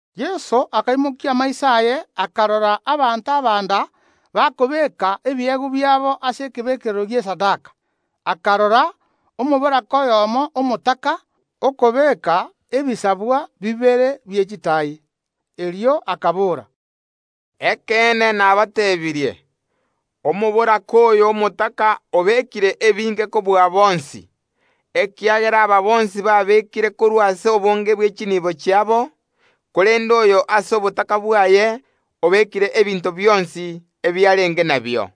Yeso akaimokia amaiso aye, akarora abanto abanda bakobeeka ebiegwa biabo ase ekebekerero gi’esadaka. Akarora omoboraka oyomo omotaka, okobeeka ebisabwa bibere bie chitaai. Erio akabora, “Ekeene nabateebirie, Omoboraka oyo omotaka obekire ebinge kobua bonsi, ekiagera aba bonsi babeekire korwa ase obonge bwe chinibo chiabo, korende oyo ase obotaka bwaye obeekire ebinto bionsi ebiarenge nabio.”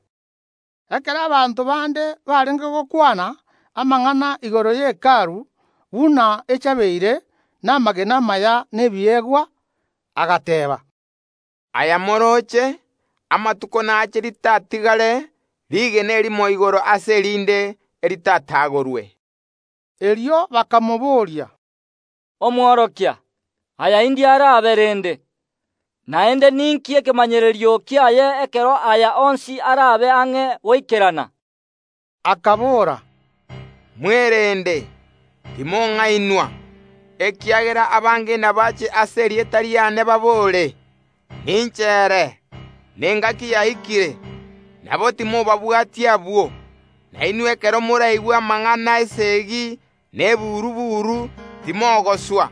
Ekero abanto bande barenge gokwana amang’ana igoro ye Hekalu, buna echabeire namagena amaya na ebiegwa, agateeba. “Aya morooche; amatuko nache ritatigare rigena erimo igoro ase erinde eritatagorwe.” Erio bakamobooria, “Omworokia, aya indi arabe rende? Naende ninki ekemanyererio kiaye ekero aya onsi araabe ang’e goikerana?” Akabora, “Mwerende, timong’ainwa, ekiagera abange nabaache ase erieta riane babore: Ninche ere! Nengaki yaikire! Nabo, timobabwatia abwo. Na inwe ekero moraigwe amang’ana y’esegi na eburu‐buru, timogoswa,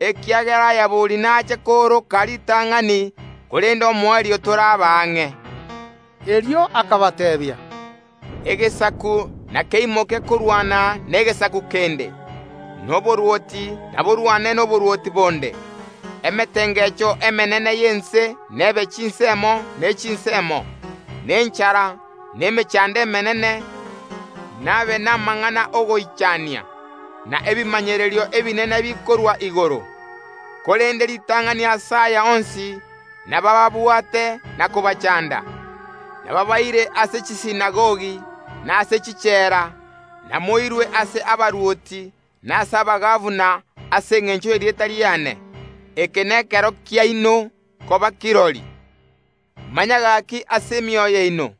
ekiagera aya bori nache kooroka ritang’ani, korende omoerio toraba ang’e.” Erio akabateebia, “Egesaku nakeimoke korwana negesaku kende, na oborwoti naborwane noborwoti bonde; emetengecho emenene y’ense nebe chinsemo ne chinsemo, na enchara, na emechando emenene; nabe namang’ana y’ogoichania, na ebimanyererio ebinene bikorwa igoro. Korende ritang’ani ase aya onsi nabababwaate na kobachanda, nabaabaire ase chisinagogi, na ase chichela, namoirwe ase abarwoti na ase abagabana ase engencho y’erieta riane. Eke nekero kiaino koba kirori. Manya gaki ase emioyo yaino,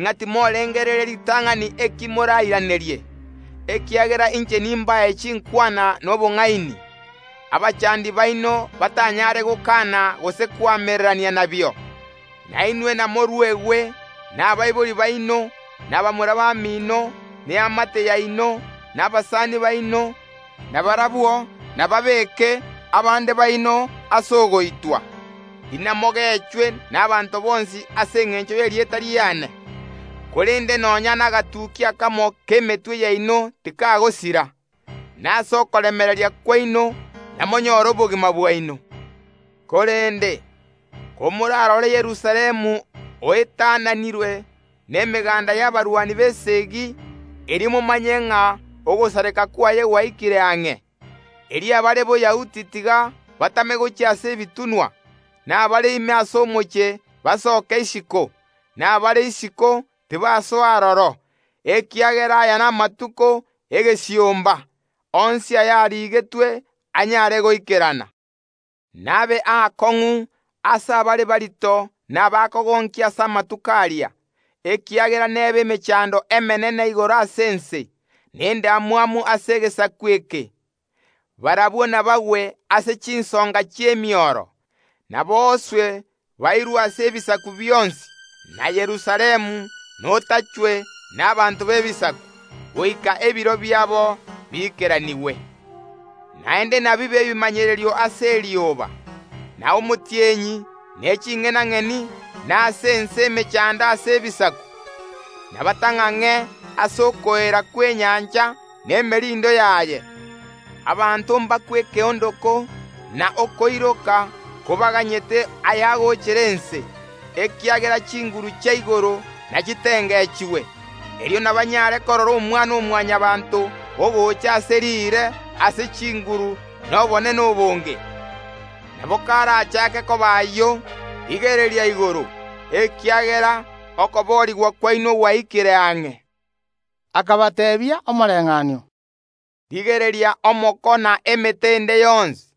ng’a timorengereria ritang’ani eki morairanerie, ekiagera inche nimbae chinkwana na obong’aini, abachandi baino batanyare gokana gose koamererania nabio. Na inwe namoruegwe nabaibori baino, na bamura bamino, na eamate yaino, na abasani baino, na barabwo nababeeke abande baino ase ogoitwa. Inamogechwe nabaanto bonsi ase engencho y’erieta riane. Korende nonya nagatukia akamo k’emetwe yaino tikagosira. Na ase okoremereria kwaino namonyoore obogima bwaino. “Korende, komorarore Yerusalemu oetananirwe nemeganda y’abarwani b’esegi, erio momanye ng’a ogosareka kwaye gwaikire ang’e. Erio abare Boyahudi tiga batame gochia ase ebitunwa, na abare ime ase omochie basoke isiko, na abare isiko tibasoa aroro, ekiagera aya namatuko egesiomba, onsi ayarigetwe anyare goikerana. Nabe aakong’u ase abare barito na abakogonkia ase amatuko aria, ekiagera nebe emechando emenene igoro ase ense, na endamwamu ase egesaku eke. Barabwo nabagwe ase chinsonga chi’emioro, nabooswe bairwe ase ebisaku bionsi, na Yerusalemu notachwe nabaanto b’Ebisaku, goika ebiro biabo biikeranigwe. “Naende nabibe ebimanyererio ase erioba, na omotienyi, ne ching’enang’eni, na ase ense emechando ase ebisaku, nabatang’ang’e ase okoeera kw’enyancha na emerindo yaye. Abanto mbakwe ekeondoko na okoiroka kobaganyete ayagoochera ense, ekiagera chinguru chia igoro nachitengechigwe. Erio nabanyare korora Omwana‐o‐Mwanyabaanto ogochaase riire ase chinguru na obonene obonge. Nabo karachake koba ayio, rigereria igoro, ekiagera okoboorigwa kwaino gwaikire ang’e.” Akabateebia omoreng’anio, “Rigereria omoko na emete ende yonsi;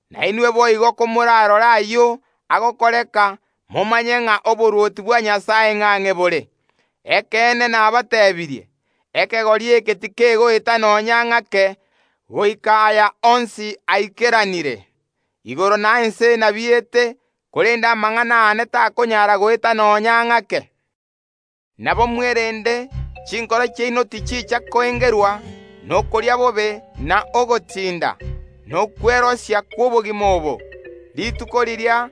Nainwe boigo komorarore ayio agokoreka, momanye ng’a oborwoti bwa Nyasae ng’ang’e bore. Ekeene nabateebirie: Ekegori eke tikegoeta nonya ng’ake goika aya onsi aikeranire. Igoro na ense nabiete, korende amang’ana aane takonyara goeta nonya ng’ake. “Nabo mwerende chinkoro chiaino tichicha koengerwa nokoria bobe na ogotinda, na okwerosia kw’obogima obo, rituko riria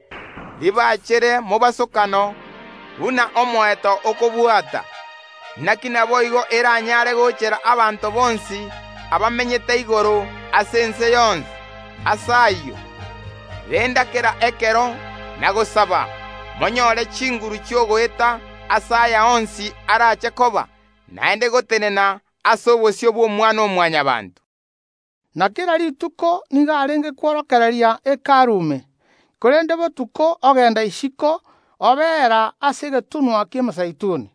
ribachere mobosokano, buna omoeto okobwata. Naki naboigo eranyaare goochera abanto bonsi abamenyete igoro ase ense yonsi. Ase ayio, renda kera ekero na gosaba, monyoore chinguru chi’ogoeta ase aya onsi araache koba, naende gotenena ase obosio bw’Omwana‐o‐Mwanyabaanto.” Na kera rituko nigo arenge kworokereria Hekalu ime, korende botuko ogenda isiko obeera ase egetunwa ki’Emezeituni.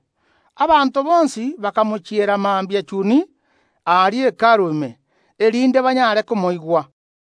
Abanto bonsi bakamochiera mambia chuni aria Hekalu ime, erinde banyaare komoigwa.